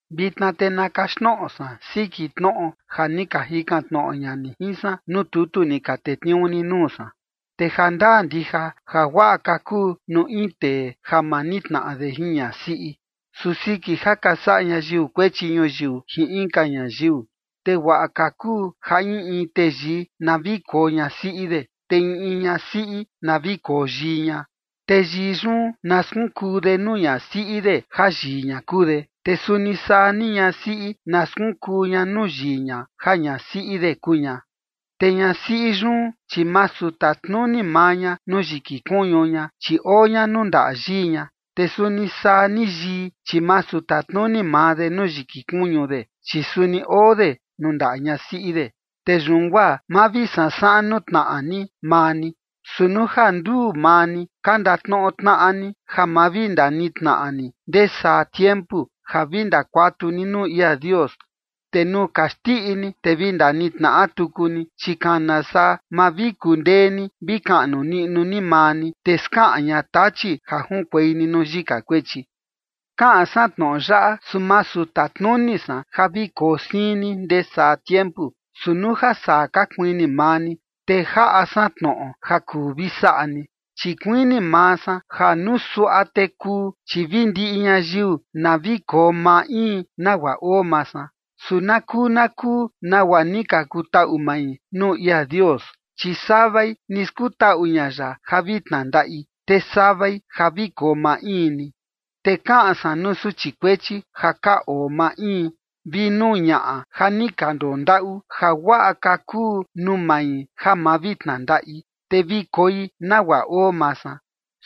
Vitna te na kaxtnoꞌo san siki tnoꞌo ja ni ka jikan tnoꞌo ña ni jin san nuu tutu ni ka tetniuu ni nuu san. Te jandaa ndija ja guaꞌa ka kuu nuu in tee ja ma nitnaꞌa de jin ñasiꞌi. Su siki ja ka saꞌa ñayiu kuechi ñuyiu jin inka ñayiu, te guaꞌa ka kuu ja in in teyii na vi koo ñasiꞌi de, te in in ñasiꞌi na vi koo yii ña. Te yii yun na skunkuu de nuu ñasiꞌi de ja yii ña kuu de, te suni saa ni ñasiꞌi na skunkuu ña nuu yii ña ja ñasiꞌi de kuu ña. Te ñasiꞌi yun, chi masu tatnuni maa ña nuu yiki kuñu ña, chi oo ña nuu ndaꞌa yii ña. Te suni saa ni yii, chi masu tatnuni maa de nuu yiki kuñu de, chi suni oo de nuu ndaꞌa ñasiꞌi de. Te yun guaa ma vi sansaꞌan nuu tnaꞌa ni maa ni. Su nuu ja nduu maa ni ka ndatnoꞌo tnaꞌa ni ja ma vi ndanitnaꞌa ni ndee saa tiempu, ja vi ndakuatu ni nuu ia Dios, te nuu ka xndiꞌi ni, te vi ndanitnaꞌa tuku ni, chi kana saa, ma vi kundee ni vi kaꞌnu niꞌnu ni maa ni, te skaꞌan ña Tachi ja junkuei ni nuu yika kuechi. Kaꞌan san tnoꞌo yaꞌa, su masu tatnuni san ja vi koo siin ni ndee saa tiempu, su nuu ja saa ka kuini maa ni, te jaꞌa san tnoꞌo ja kuu vi saꞌa ni. Chi kuini maa san ja nuu suaꞌa te kuu, chi vi ndiꞌi ñayiu na vi koo maa in nagua oo maa san, su na kuu na kuu nagua ni ka kutaꞌu mai nuu ia Dios, chi savai ni skutaꞌu ña ya ja vi tnandaꞌi, te savai ja vi koo maa in ni. Te kaꞌan san nuu suchi kuechi ja ka oo maa in, vi nuu ñaꞌa ja ni ka ndondaꞌu, ja guaꞌa ka kuu nuu mai ja ma vi tnandaꞌi, te vi koi nagua oo maa san.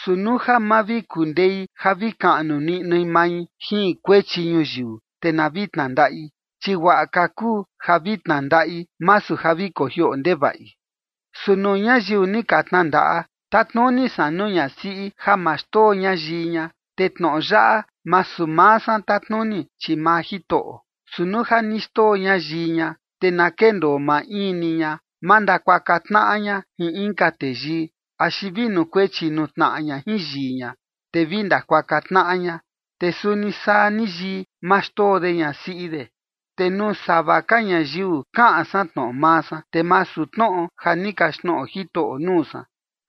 Su nuu ja ma vi kundei ja vi kaꞌnu niꞌnui mai jin kuechi ñuyiu, te na vi tnandaꞌi, chi guaꞌa ka kuu ja vi tnandaꞌi, masu ja vi kojioꞌo ndevaꞌi. Su nuu ñayiu ni ka tnandaꞌa, tatnuni san nuu ñasiꞌi ja ma xndoo ña yii ña. Te tnoꞌo yaꞌa masu maa san tatnuni, chi maa Jitoꞌo. Su nuu ja ni xndoo ña yii ña, te na kendoo maa in ni ña, ma ndakuaka tnaꞌa ña jin inka teyii, axi vi nukuechi nuu tnaꞌa ña jin yii ña, te vi ndakuaka tnaꞌa ña. Te suni saa ni yii, ma xndoo de ñasiꞌi de. Te nuu sava ka ñayiu kaꞌan san tnoꞌo maa san, te masu tnoꞌo ja ni kaxtnoꞌo Jitoꞌo nuu san: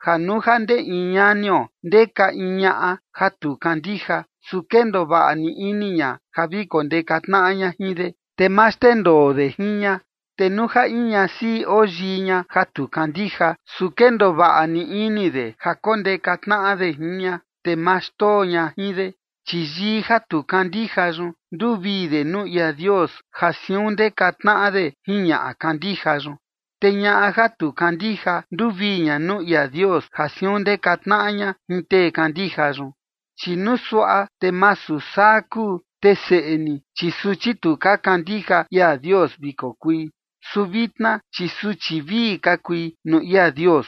ja nuu ja ndee in ñanio ndeka in ñaꞌa ja tu kandija, su kendoo vaꞌa ni ini ña ja vi kondeka tnaꞌa ña jin de, te ma xndendoo de jin ña. Te nuu ja in ñasiꞌi oo yii ña ja tu kandija, su kendoo vaꞌa ni ini de ja kondeka tnaꞌa de jin ña, te ma xndoo ña jin de. Chi yii ja tu kandija yun nduvii de nuu ia Dios ja siun ndeka tnaꞌa de jin ñaꞌa kandija yun. Te ñaꞌa ja tu kandija nduvii ña nuu ia Dios ja siun ndeka tnaꞌa ña jin tee kandija yun. Chi nuu suaꞌa te masu saa kuu, te seꞌe ni, chi suchi tu ka kandija ia Dios vi kokui. Su vitna, chi suchi vii ka kui nuu ia Dios.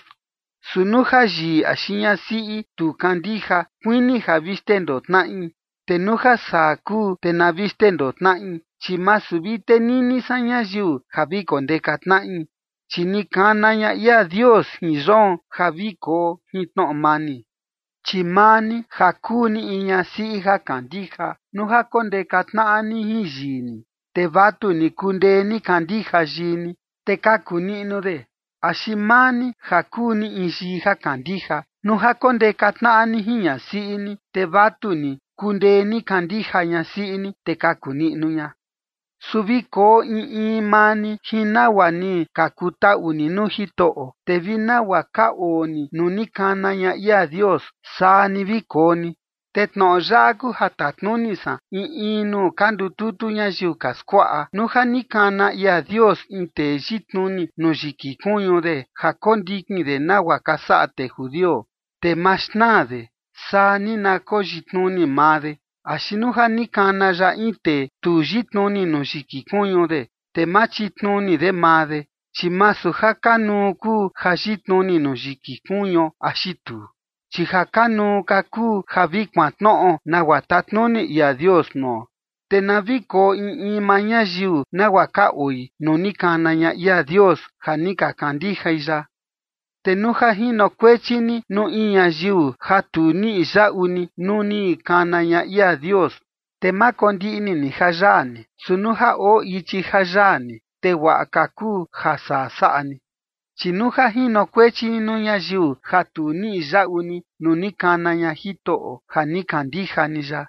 Su nuu ja yii axi ñasiꞌi tu kandija, kuini ja vi xndendoo tnaꞌi, te nuu ja saa kuu, te na vi xndendoo tnaꞌi. Chi masu vi tenini san ñayiu ja vi kondeka tnaꞌi, chi ni kana ña ia Dios jin yoon ja vi koo jin tnoꞌo mani. Chi maa ni ja kuu ni in ñasiꞌi ja kandija, nuu ja kondeka tnaꞌa ni jin yii ni, te vatuni kundee ni kandija yii ni, te kaku niꞌnu de. Axi maa ni ja kuu ni in yii ja kandija, nuu ja kondeka tnaꞌa ni jin ñasiꞌi ni, te vatuni kundee ni kandija ñasiꞌi ni, te kaku niꞌnu ña. Su vi koo in in maa ni jin nagua ni ka kutaꞌu ni nuu Jitoꞌo, te vi nagua ka oo ni nuu ni kana ña ia Dios, saa ni vi koo ni. Te tnoꞌo yaꞌa kuu ja tatnuni san in in nuu ka ndututu ñayiu ka skuaꞌa. Nuu ja ni kana ia Dios in tee yitnuni nuu yiki kuñu de ja kondikin de nagua ka saꞌa tee judio, te maa xnaa de, saa ni na koyitnuni maa de; axi nuu ja ni kana ya in tee tu yitnuni nuu yiki kuñu de, te ma chitnuni de maa de. Chi masu ja kanuu kuu ja yitnuni nuu yiki kuñuo axi tuu, chi ja kanuu ka kuu ja vi kuantnoꞌo nagua tatnuni ia Dios nuo. Te na vi koo in in maa ñayiu nagua ka oi nuu ni kana ña ia Dios, ja ni ka kandijai ya. Te nuu ja jinokuechi ni nuu in ñayiu ja tu niꞌi yaꞌu ni nuu ni kana ña ia Dios, te ma kondiꞌni ni ja yaa ni. Su nuu ja oo ichi ja yaa ni, te guaꞌa ka kuu ja saa saꞌa ni. Chi nuu ja jinokuechi ni nuu ñayiu ja tu niꞌi yaꞌu ni nuu ni kana ña Jitoꞌo ja ni kandija ni ya,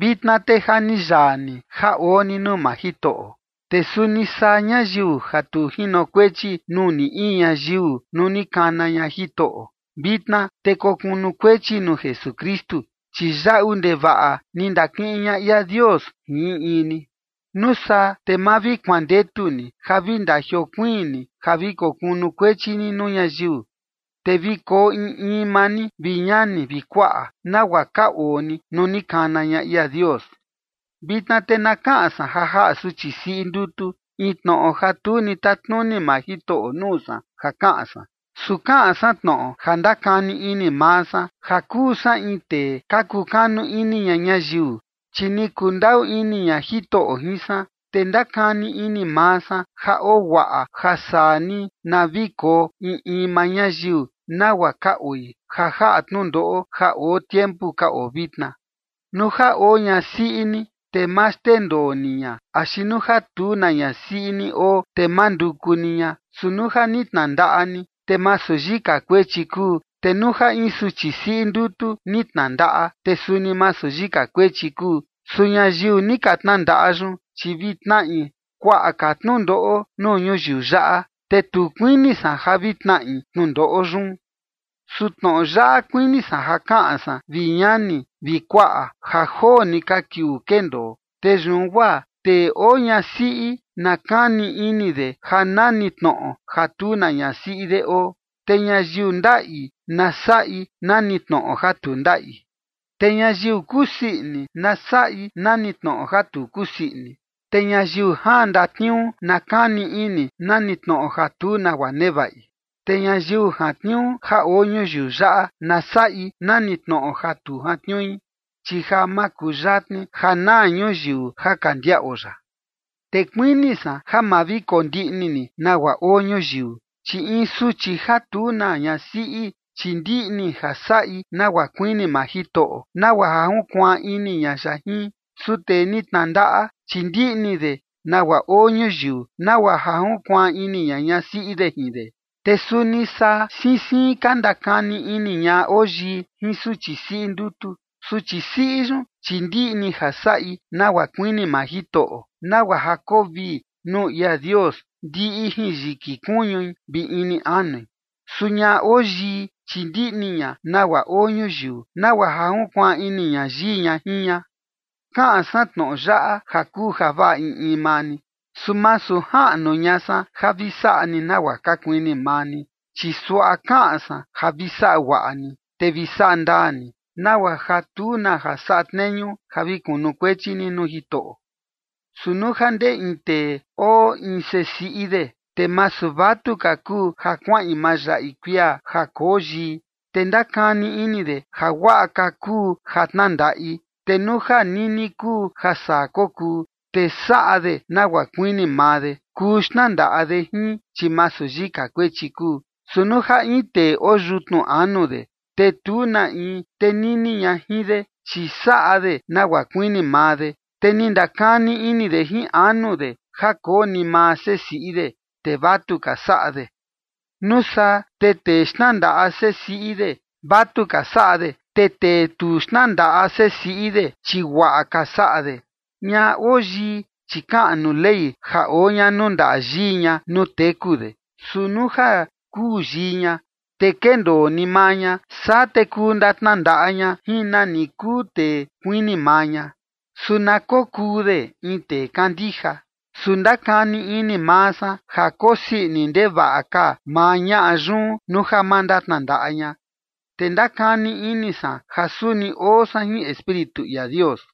vitna te ja ni yaa ni ja oo ni nuu maa Jitoꞌo. Te suni saa ñayiu ja tu jinokuechi nuu ni in ñayiu nuu ni kana ña Jitoꞌo, vitna te kokunukuechi nuu Jesukristu. Chi yaꞌu ndevaꞌa ni ndakiꞌin ña ia Dios jin in in ni. Nuu saa te ma vi kuandetu ni ja vi ndajiokuiin ni ja vi kokunukuechi ni nuu ñayiu. Te vi koo in in maa ni, vi ñani vi kuaꞌa, nagua ka oo ni nuu ni kana ña ia Dios. Vitna te na kaꞌan san ja jaꞌa suchi siꞌi ndutu in tnoꞌo ja tu ni tatnuni maa Jitoꞌo nuu san ja kaꞌan san. Su kaꞌan san tnoꞌo ja ndakani ini maa san, ja kuu san in tee ka kukanu ini ña ñayiu, chi ni kundaꞌu ini ña Jitoꞌo jin san. Te ndakani ini maa san ja oo guaꞌa ja saa ni na vi koo in in maa ñayiu nagua ka oi, ja jaꞌa tnundoꞌo ja oo tiempu ka oo vitna. Nuu ja oo ñasiꞌi ni, te ma xndendoo ni ña, axi nuu ja tu na ñasiꞌi ni oo, te ma nduku ni ña. Su nuu ja ni tnandaꞌa ni, te masu yika kuechi kuu. Te nuu ja in suchi siꞌi ndutu ni tnandaꞌa, te suni masu yika kuechi kuu. Su ñayiu ni ka tnandaꞌa yun, chi vi tnaꞌi kuaꞌa ka tnundoꞌo nuu ñuyiu yaꞌa, te tu kuini san ja vi tnaꞌi tnundoꞌo yun. Su tnoꞌo yaꞌa kuini san ja kaꞌan san, vi ñani vi kuaꞌa: Ja joo ni ka kiuu kendoo. Te yun guaa, tee oo ñasiꞌi na kani ini de ja nani tnoꞌo ja tu na ñasiꞌi de oo. Te ñayiu ndaꞌi, na saꞌi nani tnoꞌo ja tu ndaꞌi. Te ñayiu kusii ini, na saꞌi nani tnoꞌo ja tu kusii ini. Te ñayiu jaan ndatniuu, na kani ini nani tnoꞌo ja tu nagua nevaꞌi. Te ñayiu jantniuu ja oo ñuyiu yaꞌa, na saꞌi nani tnoꞌo ja tu jantniui, chi ja makuyatni ja naa ñuyiu ja ka ndiaꞌo yaꞌa. Te kuini san ja ma vi kondiꞌni ni nagua oo ñuyiu. Chi in suchi ja tu na ñasiꞌi, chi ndiꞌni ja saꞌi nagua kuini maa Jitoꞌo, nagua ja junkuaan ini ña ya jin. Su tee ni tnandaꞌa, chi ndiꞌni de nagua oo ñuyiu, nagua ja junkuaan ini ña ñasiꞌi de jin de. Te suni saa siin siin ka ndakani ini ñaꞌa oo yii jin suchi siꞌi ndutu. Suchi siꞌi yun, chi ndiꞌni ja saꞌi nagua kuini maa Jitoꞌo, nagua ja koo vii nuu ia Dios ndiꞌi jin yiki kuñui vi ini anui. Su ñaꞌa oo yii, chi ndiꞌni ña nagua oo ñuyiu, nagua ja junkuaan ini ña yii ña jin ña. Kaꞌan san tnoꞌo yaꞌa ja kuu javaꞌa in in maa ni, su masu jaꞌnu ña san ja vi saꞌa ni nagua ka kuini maa ni, chi suaꞌa kaꞌan san ja vi saꞌa guaꞌa ni, te vi saꞌa ndaa ni, nagua ja tu na ja saꞌa tneñu ja vi kunukuechi ni nuu Jitoꞌo. Su nuu ja ndee in tee oo in sesiꞌi de, te masu vatuka kuu ja kuaꞌin mayaꞌi kuia ja koo yii, te ndakani ini de ja guaꞌa ka kuu ja tnandaꞌi, te nuu ja nini kuu ja saa kokuu, te saꞌa de nagua kuini maa de. Kuu xtnandaꞌa de jin, chi masu yika kuechi kuu. Su nuu ja in tee oo yutnu anu de, te tu na in tenini ña jin de, chi saꞌa de nagua kuini maa de, te ni ndakani ini de jin anu de ja koo ni maa sesiꞌi de, te vatuka saꞌa de. Nuu saa te tee xtnandaꞌa sesiꞌi de, vatuka saꞌa de. Te tee tu xtnandaꞌa sesiꞌi de, chi guaꞌa ka saꞌa de. Ñaꞌa oo yii, chi kaꞌan nuu Ley ja oo ña nuu ndaꞌa yii ña nuu teku de. Su nuu ja kuu yii ña, te kendoo ni maa ña, saa te kuu ndatnandaꞌa ña jin nani kuu tee kuini maa ña. Su na kokuu de in tee kandija. Su ndakani ini maa san ja kosii ini ndevaꞌa ka maa ñaꞌa yun nuu ja ma ndatnandaꞌa ña. Te ndakani ini san ja suni oo san jin Espíritu ia Dios.